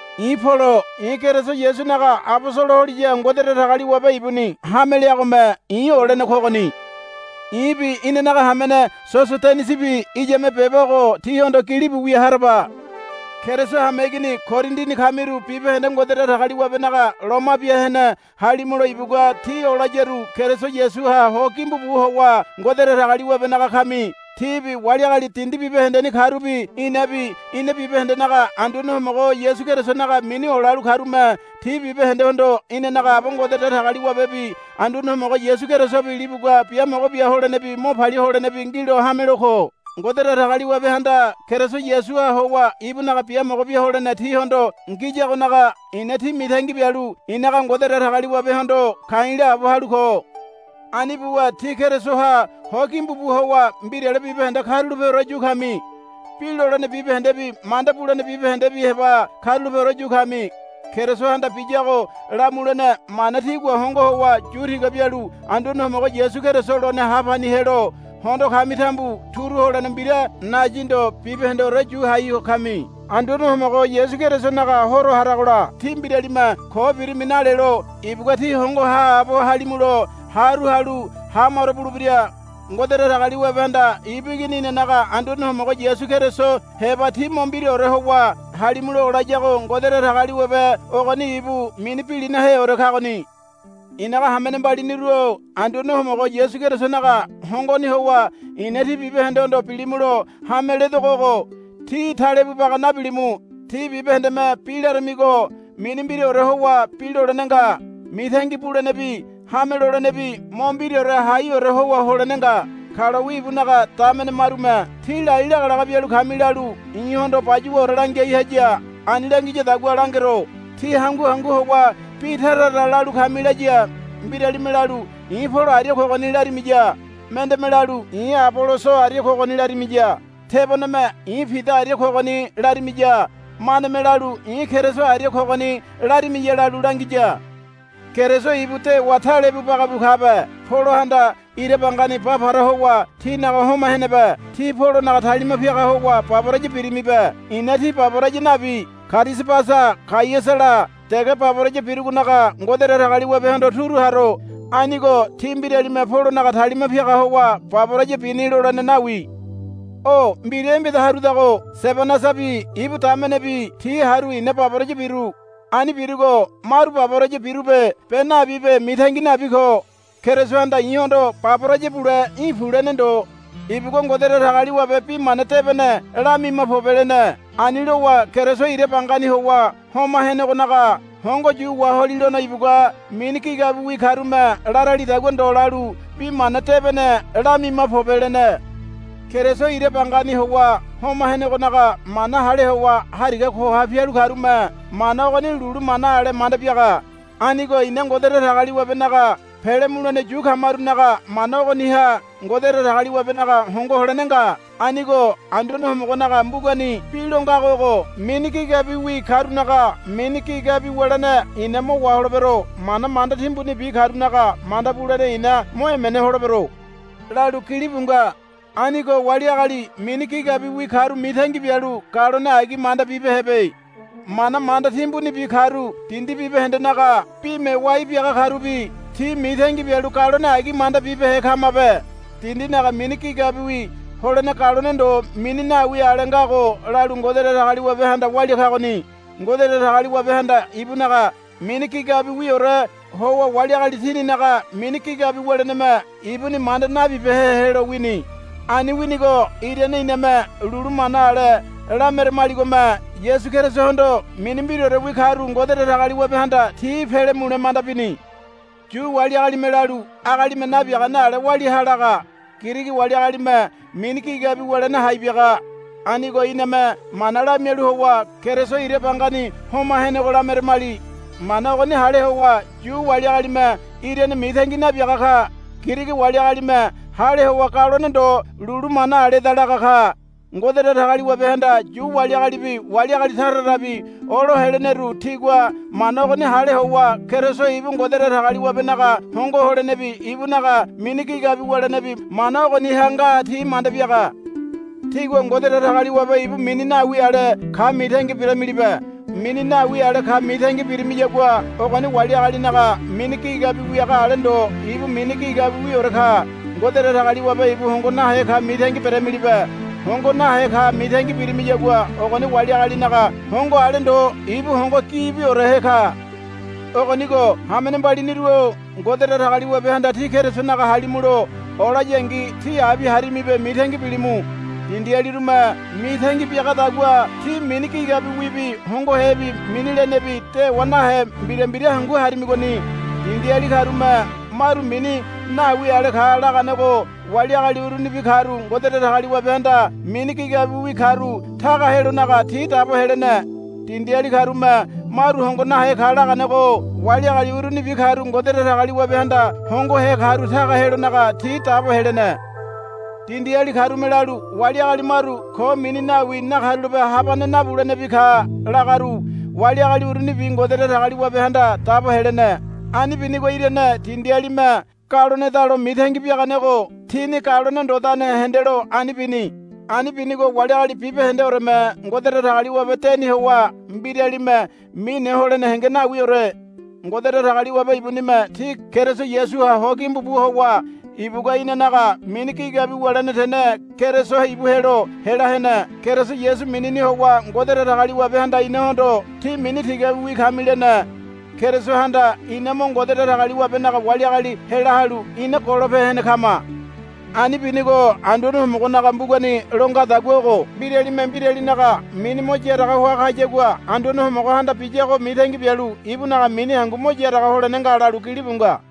I̱ Polo. I̱ Keriso Yasunaga abosolo holiya Ngode Datagaliwabe ibuni hame leagome i̱ olene kogoni. I̱bi inanaga hamene Sosodenisibi iyame beba ogo tíhondo gilibu wia haraba. Keriso hameigini Korindini kamiru bibahende Ngode Datagaliwabenaga loma bia hene halimulo ibugua tí olayaru Keriso Yasuha ho gimbu bu howa Ngode Datagaliwabenaga kami. Tíbi wali agali dindi bibahendeni karubi inabi ina bibahendenaga Anduane Homogo Yasu Kerisonaga mini olalu karume tí bibahendehondo inanaga Aba Ngode Datagaliwabebi Anduane Homogo Yasu Kerisobi libugua biamogo bia holenebi mo palia holenebi ngilo hamelo ko. Ngode Datagaliwabehanda Keriso Yasuha howa ibunaga biamogo bia holene tíhondo ngiyagonaga i̱na tí mitangi bialu i̱naga Ngode Datagaliwabehondo ka̱i̱ laabo halu ko. Ani buwa tí Kerisoha ho gimbu bu howa mbirale bibahende karulapeore yu kami. Bi lolene bibahendebi manda bulene bibahendebi heba karulapeore yu kami. Kerisohanda biyago lamulene mana tígua hongo howa yu tiga bialu Anduane Homogo Yasu Keriso lone ha pani helo hondo kami tambu turu holene mbira nayi ndo bibahendeore yu hai ho kami. Anduane Homogo Yasu Kerisonaga Horo haragola tí mbiralime ko birimi nalelo ibugua tí hongo haabo halimulo haru halu hamaro bulebira. Ngode Datagaliwabehanda ibu Igini inanaga Anduane Homogo Yasu Keriso heba tí mo mbiraore howa halimulo olayago Ngode Datagaliwabe ogoni ibu mini bilinaheore kagoni. I̱naga hamene mbaliniru-o Anduane Homogo Yasu Kerisonaga hongoni howa i̱na tí bibahendehondo bilimulo hame ledogo ogo. Tí talebu baga nabilimu. Tí bibahendeme bi laramigo mini mbiraore howa bi lolene nga. Mitangi bulenebi hame lolenebi mo mbiraore haiore howa holene nga. Kalowi ibunaga damene marume, Tí lai lagalaga bialu kami, lalu i̱hondo bayuwaore langiai haya. Ani langiyadagua langero. Tí hangu hangu howa bi tara tara lalu kami laya. Mbirame lalu, I̱ Polo aria kogoni, larimiya. Mendeme lalu, I̱ Aboloso aria kogoni, larimiya. Teboneme, I̱ Pida aria kogoni, larimiya. Maneme lalu, I̱ Keriso aria kogoni, larimiya lalu langiya. Keriso ibu dewa talebu baga bu kabe. Polohanda ira bangani ba para howa tínaga homa henebe. Tí Polonaga talima piaga howa baboraya birimibe. I̱na tí baboraya nabi Karisabasa Gaiasala dege baboraya birugonaga Ngode Datagaliwabehondo turu haro. Anigo tí mbiralime Polonaga talima piaga howa baboraya bini lolene nawi. O mbira embeda harudago Sebanasabi ibu damenebi ti haru i̱na baboraya biru. Ani birugo maru baboraya birube be nabibe mitangi nabi ko. Kerisohanda i̱hondo, Baboraya bule í̠ pu, lene ndo. Ibugua, Ngode Datagaliwabe Bi Mana Debene lamima pobe, lene. Ani lowa Keriso ira bangani howa homa henegonaga hongo yu waholilono ibugua, Mini gigabiwi karume laralidagua ndo lalu Bi Mana Debene lamima pobe, lene. Keriso ira bangani howa homa henegonaga mana hale howa hariga koha pialu karume mana ogoni lulu mana ale manda biaga. Anigo ina Ngode Datagaliwabenaga pele mulene yu kamarunaga mana ogoniha Ngode Datagaliwabenaga hongo holene nga. Anigo Anduane Homogonaga mbugani bi lo ngago ogo, Mini gigabiwi karunaga mini gigabi wulene i̱na mo waholebero. Mana manda timbunibi karunaga manda bulene i̱na mo emene holebero, lalu gilibu nga. Anigo wali agali mini gigabiwi karu mitangi bialu galone agi manda bibehebe. Mana manda timbunibi karu dindi bibahendenaga bime wai biaga karubi ti mitangi bialu galone agi manda bibehe kamabe. Dindinaga mini gigabiwi holene galone ndo mini nawi ale ngago lalu Ngode Datagaliwabehanda walia kagoni. Ngode Datagaliwabehanda ibunaga mini gigabiwiore howa wali agali tininaga mini gigabi wuleneme ibuni manda nabibehe helo wini. Ani winigo irane iname lulu mana ale lameramaligome Yasu Kerisohondo mini mbiraorewi karu Ngode Datagaliwabehanda ti pele mule manda bini. Yu wali agalime lalu, Agalime nabiagane ale walia ha, laga. Girigi wali agalime mini gigabi wulene hai biaga. Anigo iname mana lamialu howa, Keriso ira bangani homa henego, lameramali. Mana ogoni hale howa Yu wali agalime irane mitangi nabiaga ka. Girigi wali agalime hale howa galone ndo lulu mana aleda laga ka. Ngode Datagaliwabehanda Yu wali agalibi wali agali tara tarabi olo heleneru tigua mana ogoni hale howa Keriso ibu Ngode Datagaliwabenaga hongo holenebi ibunaga mini gigabi wulenebi mana ogoniha nga ti manda biaga. Tígua Ngode Datagaliwabe ibu mini nawi ale ka mitangi beramilibe. Mini nawi ale ka mitangi birimiyagua ogoni wali agalinaga mini gigabi wiaga ale ndo ibu mini gigabiorewi ka. Ngode Datagaliwabe ibu hongo nahe ka mitangi beramilibe. Hongo nahe ka mitangi birimiyagua ogoni wali agalinaga hongo ale ndo ibu hongo gibiorehe ka. Ogonigo hamene mbaliniru-o Ngode Datagaliwabehanda tí Kerisonaga halimulo olayangi tí abi harimibe mitangi bilimu. Dindialirume mitangi biagadagua tí mini gigabiwibi hongohebi mini lenebi dewa nahe mbira mbira hangu harimigoni. Dindiali karume maru mini nawi ale ka laganego wali agali urunibi karu Ngode Datagaliwabehanda mini gigabiwi karu taga helonaga ti dabo helene. Dindiali karume maru hongo nahe ka laganego wali agali urunibi karu Ngode Datagaliwabehanda hongohe karu taga helonaga ti dabo helene. Dindiali karume lalu, Wali agali maru ko mini nawi nakarulape habane nabulenebi ka, lagaru wali agali urunibi Ngode Datagaliwabehanda dabo helene. Ani binigo irane dindialime galonedalo mitangi biaganego tini galone ndodane hendelo ani bini. Ani binigo wali agali bibahendeoreme Ngode Datagaliwabe deni howa mbiralime mine holene henge nawiore. Ngode Datagaliwabe ibunime tí Keriso Yasuha ho gimbu bu howa ibugua inanaga mini gigabi wulene tene Keriso ibu helo hela hene. Keriso Yasu minini howa Ngode Datagaliwabehanda inahondo, Tí mini tigabiwi kami, lene. Kerisohanda ina mo Ngode Datagaliwabenaga wali agali hela halu ina golope hene kama. Ani binigo Anduane Homogonaga mbugani lo ngadagua ogo, Mbiralime mbiralinaga mini mo yaraga hoa kayagua Anduane Homogohanda biyago mitangi bialu ibunaga mini hangu mo yaraga holene nga, lalu gilibu nga.